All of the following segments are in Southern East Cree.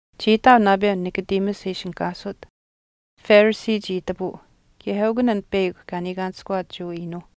Chii ihtaau naapeu Nicodemus e ishinihkaasut, Pharisee chii itapuu kaye eukun an peyakw kaa niikaanishkuwaat Jewa iinuuh.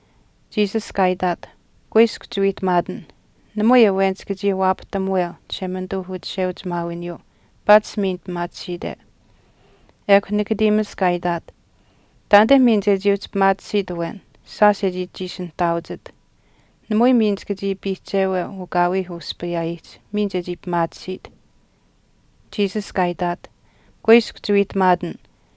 Jesus kaa itaat, “Kuiskw chiwiihtamaatin, namui awen chika chii waapahtamuweu Chishemanituu uchisheuchimaawiniyuu paatish miin pimaatisiite.” Ekw Nicodemus kaa itaat, “Taanite miin chechii uhchi pimaatisiit awen shaash e chiishi nihtaauchit. Namui miin chika chii piihcheweu ukaawiih uspayaayihch miin chechii pimaatisiit.” Jesus kaa itaat, “Kuiskw chiwiihtamaatin,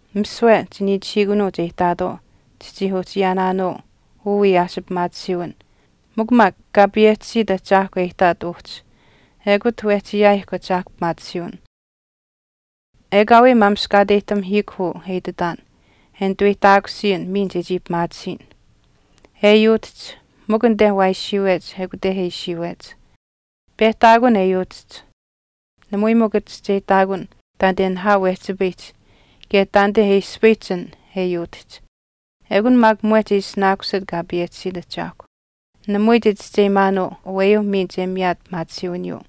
Misiwe chiniichihiikunuuch e ihtaatwaau chichii uhchi ayaanaanuu uu wiyaas pimaatisiiwin. Mikw maak kaa payehchisiit ahchaahkw e ihtaat uhchi ekut wehchi ayaayihkw Ahchaahkw pimaatisiiwin. Ekaawii maamishkaateyihtamihiikw uu e ititaan e nituweyihtaakusiyin miin chechii pimaatisiyin. E yuutihch, mikw anite waa ishiiwech ekute e ishiiwech. Pehtaakun e yuutihch namui mikw chischeyihtaakun taanite nihaau wehchipayihch kaye taanite e ispayihch an e yuutihch. Ekun maak mwehch e ishinaakusit Kaa payehchisiit Ahchaahkw, namui chichischeyimaanuu aweyuu miin che miyaat pimaatisiiwiniyuu.”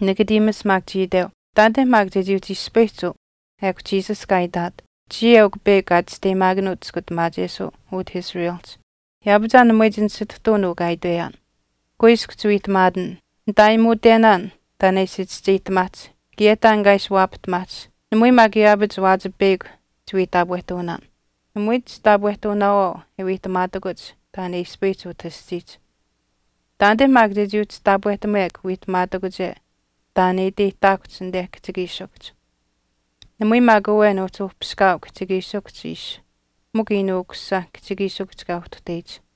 Nicodemus maak chii iteu, “Taanite maak chechii uhchi ispayihch uu.” Ekw Jesus kaa itaat, “Chiya eukw peyakw kaa chisteyimaakanuut chiskutamaachesuu utah Israelihch, yaapach aa namui chinisituhtuun uu kaa itweyaan. Kuiskw chiwiihtamaatin. Nitaayimuutenaan taan e ishi chischeyihtamaahch kaye taan kaa ishi waapahtamaahch namui maak yaapach waachipeyakw chiwii taapwehtuunaan. Namui chitaapwehtuunaawaau e wiihtamaatakuch taan e ispayihch utah aschiihch. Taanite maak chechii uhchi taapwehtamekw wiihtamaatakuche taan e iteyihtaakuhch anite kihchikiishikuhch. Namui maak awen uhchi uhpiskaau kihchikiishikuhch ishi mikw Iinuu Ukusisa kihchikiishikuhch kaa uhtuhteyich.”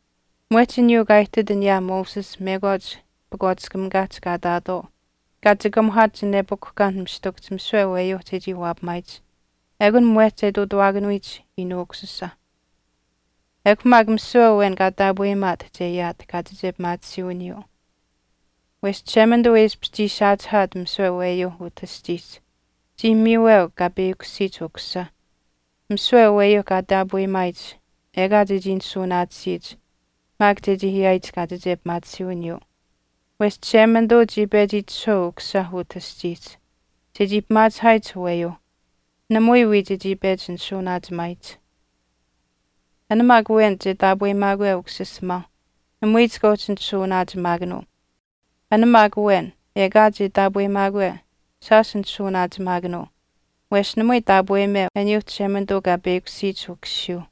Mwehch aniyuu kaa ihtit aniyaa Moses mekwaach pakwaatiskamikaahch kaa ihtaatwaau kaa chikamuhaat chinepukuhkaan mistikuhch misiwe aweyuu chechii waapamaayich, ekun mwehch che ihtuutuwaakanuyich Iinuu Ukusisa. Ekw maak misiwe awen kaa taapweyimaat che ayaat kaachiche pimaatisiiwiniyuu. Wesh Chishemanituu e ishpish chii saachihaat misiwe aweyuu utah aschiihch chii miiweu kaa peyakushiyich Ukusisa, misiwe aweyuuh kaa taapweyimaayich ekaa chechii nishuunaatisiyich maak chechii ayaayich kaachiche pimaatisiiwiniyuu. Wesh Chishemanituu chii pechi itishahweu Ukusisa utah aschiihch chechii pimaachihaayich aweyuuh namui wii chechii pechi nishuuwanaachimaayich. An maak awen che taapweyimaakwe Ukusisimaauh namui chika uhchi nishuuwanaachimaakanuu, an maak awen ekaa che taapeyimaakwe shaash nishuuwanaachimaakanuu wesh namui taapweyimeu aniyuu Chishemanituu kaa peyakushiyich Ukusiyuuh.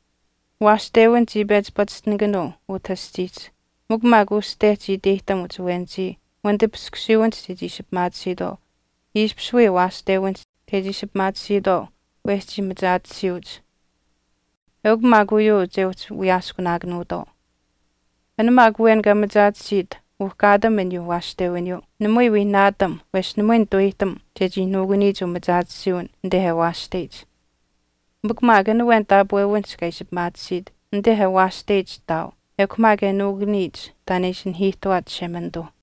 Waashtewin chii pechi pachishtinaakanuu utah aschiihch mikw maak uste chii iteyihtamuch awenichii wanitipiskusiiwinihch chechii ishi pimaatisiitwaau ishpish wii waashtewinihch chechii ishi pimaatisiitwaau wesh chii machaatisiyuuch. Eukw maak uyuu che uhchi wiyaaskunaakanuutwaau. An maak awen kaa machaatisiit uhkaatam aniyuu waashtewiniyuu namui wii naatam wesh namui nituweyihtam chechii nuukuniyich umachaatisiiwin anite e waashteyich. Mikw maak an awen taapwewinihch kaa ishi pimaatisiit anite e waashteyich ihtaau ekw maak e nuukuniyich taan e ishi nanihiihtuwaat Chishemanituu.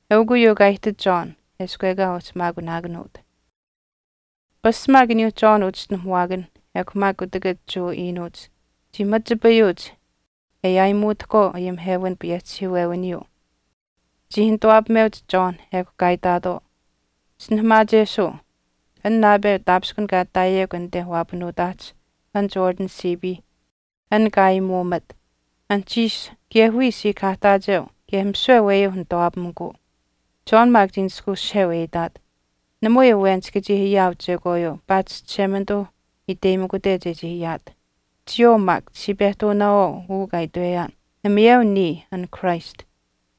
Eukw uyuu kaa ihtit John eshkw ekaa uhchi maakunaakanuut. Pasch maak aniyuuh John uchischinuhamuwaakanh ekw maak kutakach Jewa iinuuch chii machipayuuch e aayimuutahkwaau ayimihewin payehchihiiwewiniyuu. Chii nituwaapameuch John ekw kaa itaatwaau, “Chischinuhamaachesuu, an naapeu taapishkun kaa ihtaayekw anite waapanuutaahch an Jordan siipiihch, an kaa aayimuumat, anuhchiish kaye wiya siikahaahtaacheu kaye misiwe aweyuuh nituwaapamikuu.” John maak chii nishkweushiheu e itaat, “Namui awen chika chii ayaau chekwaayuu paatish Chishemanituu iteyimikute chechii ayaat. Chiyawaau maak chichii pehtuunaawaau uu kaa itweyaan, ‘Namayeu niya an Christ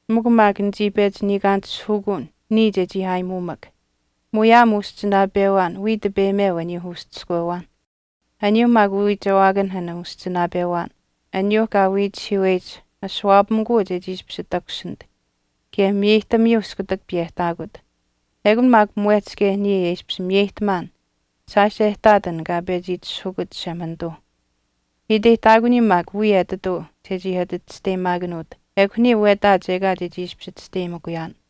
mikw maak nichii pechi niikaanitishihukuun niya chechii aayimuumak.’ Muyaam uschinaapewaan wiya tipeyimeu aniyuu uschiskwewaan. Aniyuu maak uwiichewaakanh an uschinaapewaan, aniyuu kaa wiichihiiweyich ashuwaapamikuu che ishpish takushinit kaye miyeyihtamiyuu iskutak piyehtaakut. Ekun maak mwehch kaye niya e ishpish miyeyihtamaan shaash e ihtaat an kaa pechi itishahukut Chishemanituu. Iteyihtaakuniyuu maak wiya etituu chechii ati chisteyimaakanuut ekw niya wetaach ekaa chechii ishpish chisteyimikuyaan.”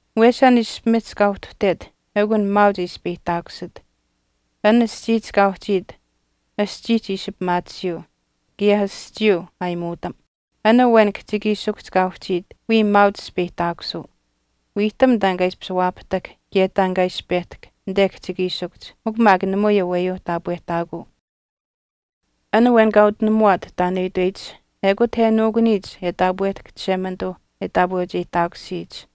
Wesh an ishpimihch kaa uhtuhtet eukw an maauch e ispeyihtaakusit. An aschiihch kaa uhchiit, aschiihch ishi pimaatisiyuu, kaye aschiiyuu aayimuutam. An awen kihchikiishikuhch kaa uhchiit wiya maauch ispeyihtaakusuu. Wiihtam taan kaa ishi waapahtahk kaye taan kaa ishi pehtahk anite kihchikiishikuhch mikw maak namui aweyuuh taapwehtaakuu. An awen kaa utinamuwaat taan e itweyich ekut e nuukuniyich e taapwehtahk Chishemanituuh e taapweucheyihtaakusiyich.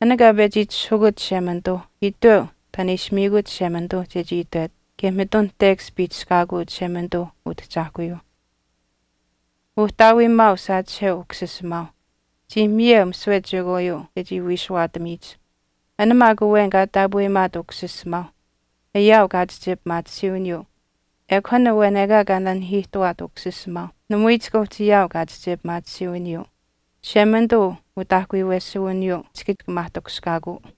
An kaa pechi itishahukut Chishemanituu iteu taan e ishi miikut Chishemanituuh chechii itwet kaye mitun tekash piihchishkaakuu Chishemanituu Utahchaahkuyuuh. Uhtaawiimaau saachiheu Ukusisimaau. Chii miyeu misiwe chekwaayuu chechii wiishuwaatamiyich. An maak awen kaa taapweyimaat Ukusisimaau ayaau kaachiche pimaatisiiwiniyuu, ekw an awen ekaa kaa nanihiihtuwaat Ukusisimaau namui chika uhchi ayaau kaachiche pimaatisiiwiniyuu. Chishemanituu utaahkuyuwesuwiniyuu chika maahtakushkaakuu.